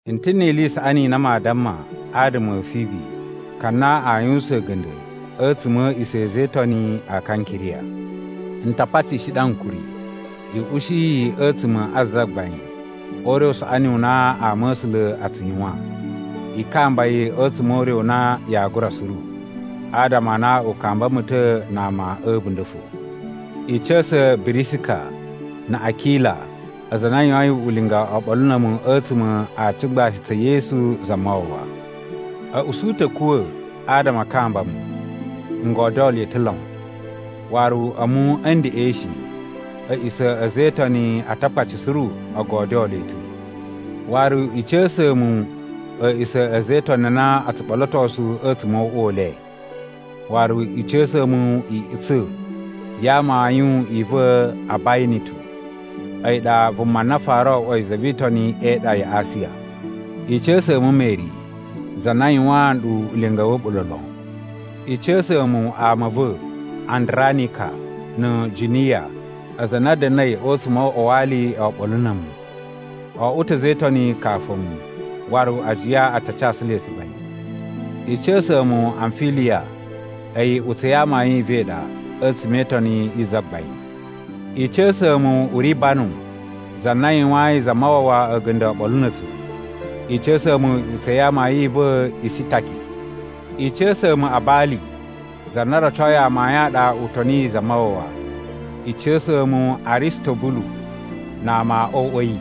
N ta̱ ni ili i saꞌani i na maa damma adama a̱ Fibi, ka na a yuwusan a̱ga̱nda̱ a̱tsuma̱ a̱ a̱a̱ꞌisa̱ a̱ a̱za̱ e Itoni a Kankiriya. N ta patishi ɗu ankuri i ushi yi a̱tsuma̱ a Zagbain o ure u saꞌani u na ama a̱ A̱sula̱ aa tsu yuwan. I kamba yi a̱tsuma̱ o ure u na yaa gura suru, adama a na u kamba mu ta̱ na ama a̱ a̱bunda̱ fo. I ca̱sa̱ Birisika na̱ Akila, aza a na a yuwain ulinga oɓolo na̱ a̱mu a̱tsuma̱ a tsugbashi tsa̱ Yesu Zamawawa. A̱ usu ta̱ a̱ kuwa̱ adama a kamba mu. N godyoo le ta̱ lon, waru a̱mu a̱ ndeꞌen shi a̱ꞌisa̱ a̱ a̱za̱ e Itoni a Atakpaci suru o godyoo le ta̱. Waru, i ca̱sa̱a̱ mu a̱a̱ꞌisa̱ a̱ a̱za̱ e Itoni a na o tsu ɓolotosu a̱tsuma̱ o uꞌwa u le. Waru i ca̱sa̱a̱ mu iꞌutsa̱ ya amayun i va̱ Abayinitu. A̱yi ɗa vuma na fara oꞌwoi za vi Itoni e iɗa ya Asiya. I ca̱sa̱a̱ mu Meri, za na yuwaan ɗu ulinga wa̱ a̱ɓula̱ lon. I ca̱sa̱a̱ mu ama a̱ va̱, Andranika na̱ Juniya, aza a na a̱ da̱na̱i a̱tsuma̱ o uꞌwa wa ali oɓolo na̱ a̱mu. O oꞌwo ta̱ a̱za̱ e Itoni kafu a̱mu, waru ajiya a ta casu le tsugbain. I ca̱sa̱a̱ mu Amfiliya, a̱yi iꞌutsa̱ ya amayun i va̱ i ɗa a̱tsuma̱ e itoni yi Zagbain. I ca̱sa̱a̱ mu Uribanu, za na yuwayin Zamawawa a̱ga̱nda̱ oɓolo na̱ a̱tsu. I ca̱sa̱a̱ mu iꞌutsa̱ ya amayun i va̱ Isitaki. I ca̱sa̱a̱ mu Abali, za na rocoi amayun a ɗa u toniyi Zamawawa. I ca̱sa̱a̱ mu Aristobulu na ama o uꞌwa a̱ yi.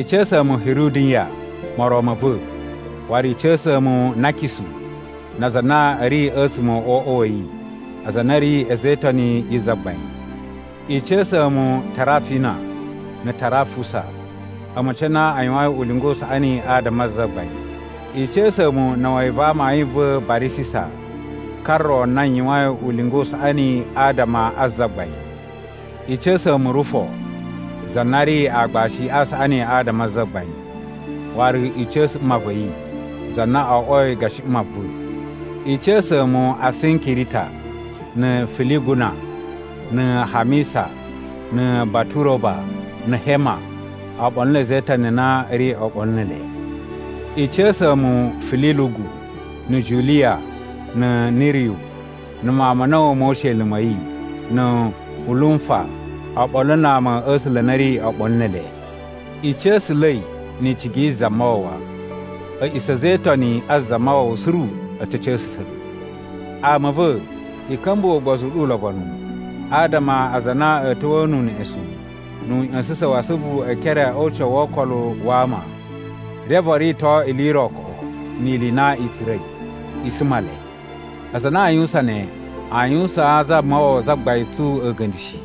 I ca̱sa̱a̱ mu Hiruduyan, moron ma̱ va̱. Waru i ca̱sa̱a̱ mu Nakisu na aza a na a̱ ri a̱tsuma̱ o uꞌwa wa̱ yi, aza a na a̱ ri a̱za̱ e Itoni yi Zagbain. I ca̱sa̱a̱ mu Tarafina na̱ Tarafusa, a̱ma̱ci a na a yuwain ulinga u saꞌani adama a Zagbain. I ca̱sa̱a̱ mu na̱wa̱yi va amayun va̱ Barisisa, ka ro na yuwain ulinga u saꞌani adama a Zagbain. I ca̱sa̱a̱ mu Rufo, za na ri aagbashi a saꞌani adama a Zagbain. Waru i ca̱sa̱ mma va̱ yi, za na oꞌwoi gashi mma va̱. I ca̱sa̱a̱ mu Asinkirita, na̱ Filiguna, na̱ Hamisa, na̱ Baturoba, na̱ Hema, oɓolo na̱ a̱za̱ e Itoni a na a̱ ri oɓolo ne ele. I ca̱sa̱a̱ mu Fililugu, na̱ Juliya, na̱ Niriyu, na̱ mawun ma̱ a̱na̱wu mo usheli ma̱ yi, na̱ Ulumfa, oɓolo na ama a̱ A̱sula̱ a na a̱ ri oɓolo ne ele. I ca̱sa̱la̱i ni icigi yi Zamawawa. A̱ꞌisa̱ a̱ a̱za̱ e Itoni a Zamawawa suru a̱ ta̱ ca̱sa̱sa̱ ɗu. Ama a̱ va̱, i ka̱mbuwa̱ ugbozu u ɗu ulobonu adama a aza a na a̱a̱ ta̱wa̱a̱ nu uneꞌesun nu uꞌya̱sa̱sa̱n wa asuvu e ekere o ucawu wo okolo wa ama, reve o rito ili i ro koꞌo ni ili i na i tsura̱i. I suma le! Aza a na a yuwusan ne a yuwusaan Zamawawa Zagbain tsu a̱ga̱nda̱ shi,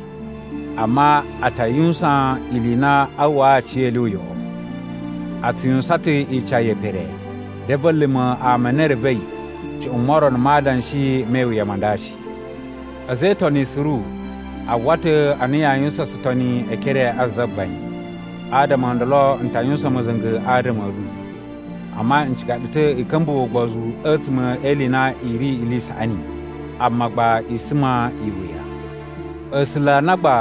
amma a ta yuwusan ili i na aa uwwaa aciyele uyoꞌo. A tsu yuwusan ta̱ ica ye pere, reve a̱ luma̱ ama a na e revei cuꞌun morono ma adanshi me iwuya ma nda shi. A̱za̱ e Itoni suru a uwwa ta̱ a na yaa yuwusan tsutoni e ekere a Zagbain, adama o ndolo n ta yuwusan ma̱za̱nga̱ adama a̱ ɗu. Amma n ciga ɗu ta̱ i ka̱mbuwa̱ ugbozu a̱tsuma̱ e ili i na i ri ili i saꞌani, amma gba i suma iwuya. A̱sula̱ a na gba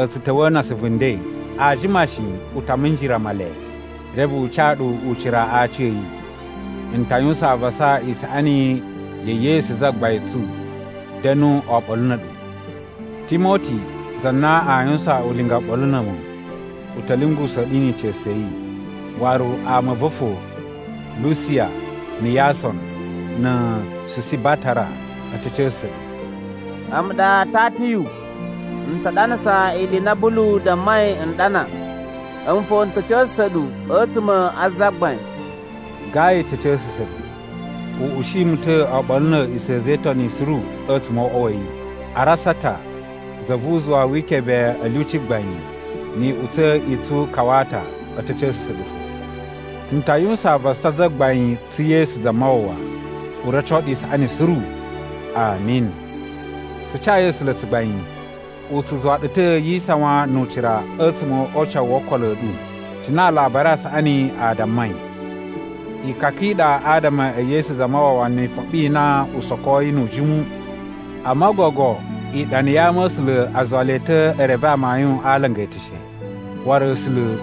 a̱ tsu ta̱wa̱a̱ na asuvu nden, aa jima shi u ta minjira Male reve u ca ɗu ucira a aci a̱ yi. N ta yuwusan avasa isaꞌani ya̱ Yesu Zagbain tsu da̱nu oɓolo na̱ a̱ɗu. Timoti za na a yuwusan ulinga oɓolo na̱ a̱mu, u ta̱ lyungusa̱a̱ ɗu ni ica̱su ya̱ yi. Waru ama a̱ va̱ fo, Lusiya, na̱ Yason, na̱ Susibatara a̱ ta̱ ca̱sa̱sa̱ ɗu. A̱mu ɗa Tatiyu, n ta ɗanasa ili i na Bulu dammai n ɗana. A̱mu fo n ta̱ ca̱sa̱sa̱ ɗu a̱tsuma̱ a Zagbain. Gayu ta̱ ca̱sa̱sa̱ ɗu. U ushi mu ta̱ oɓolo na̱ a̱a̱ꞌisa̱ a̱ a̱za̱ e Itoni suru a̱tsuma̱ o uꞌwa wa̱ yi. Arasata, za vu uzuwa wi ikebe a̱ lyuci gbain, ni iꞌutsa̱ i tsu Kawata a̱ ta̱ ca̱sa̱sa̱ ɗu fo. N ta yuwusan avasa Zagbain tsu Yesu Zamawawa u roco ɗu isaꞌani suru. Ami. Tsu cayi A̱sula̱ tsugbain! U tsu zuwa ɗu ta̱ yi isawan nu ucira a̱tsuma̱ o ucawu wo okolo a̱ ɗu, cine Alabari a Saꞌani a dammai. Ikaka i ɗa adama e Yesu Zamawawa ni ifoɓi i na u sokoi nu ujimu. Amma gogo iɗana ya ama̱sula̱ a zuwa le ta̱ e reve amayun a alanga e eteshe. Waru A̱sula̱,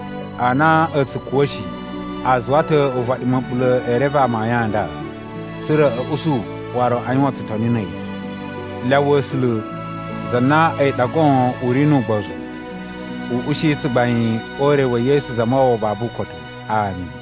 a na a̱ tsu kuwa̱ shi, a zuwa ta̱ uvaɗi ma̱ɓula̱ e reve amayun a nda, tsa̱ra̱ a̱ usu waru aa yuwan tsutoni na̱ a̱yi. Lyawa A̱sula̱, za na a̱yi ɗa goon u ri nu ugbozu, u ushi tsugbain o ure wa̱ Yesu Zamawawa babu ukotu. Ami.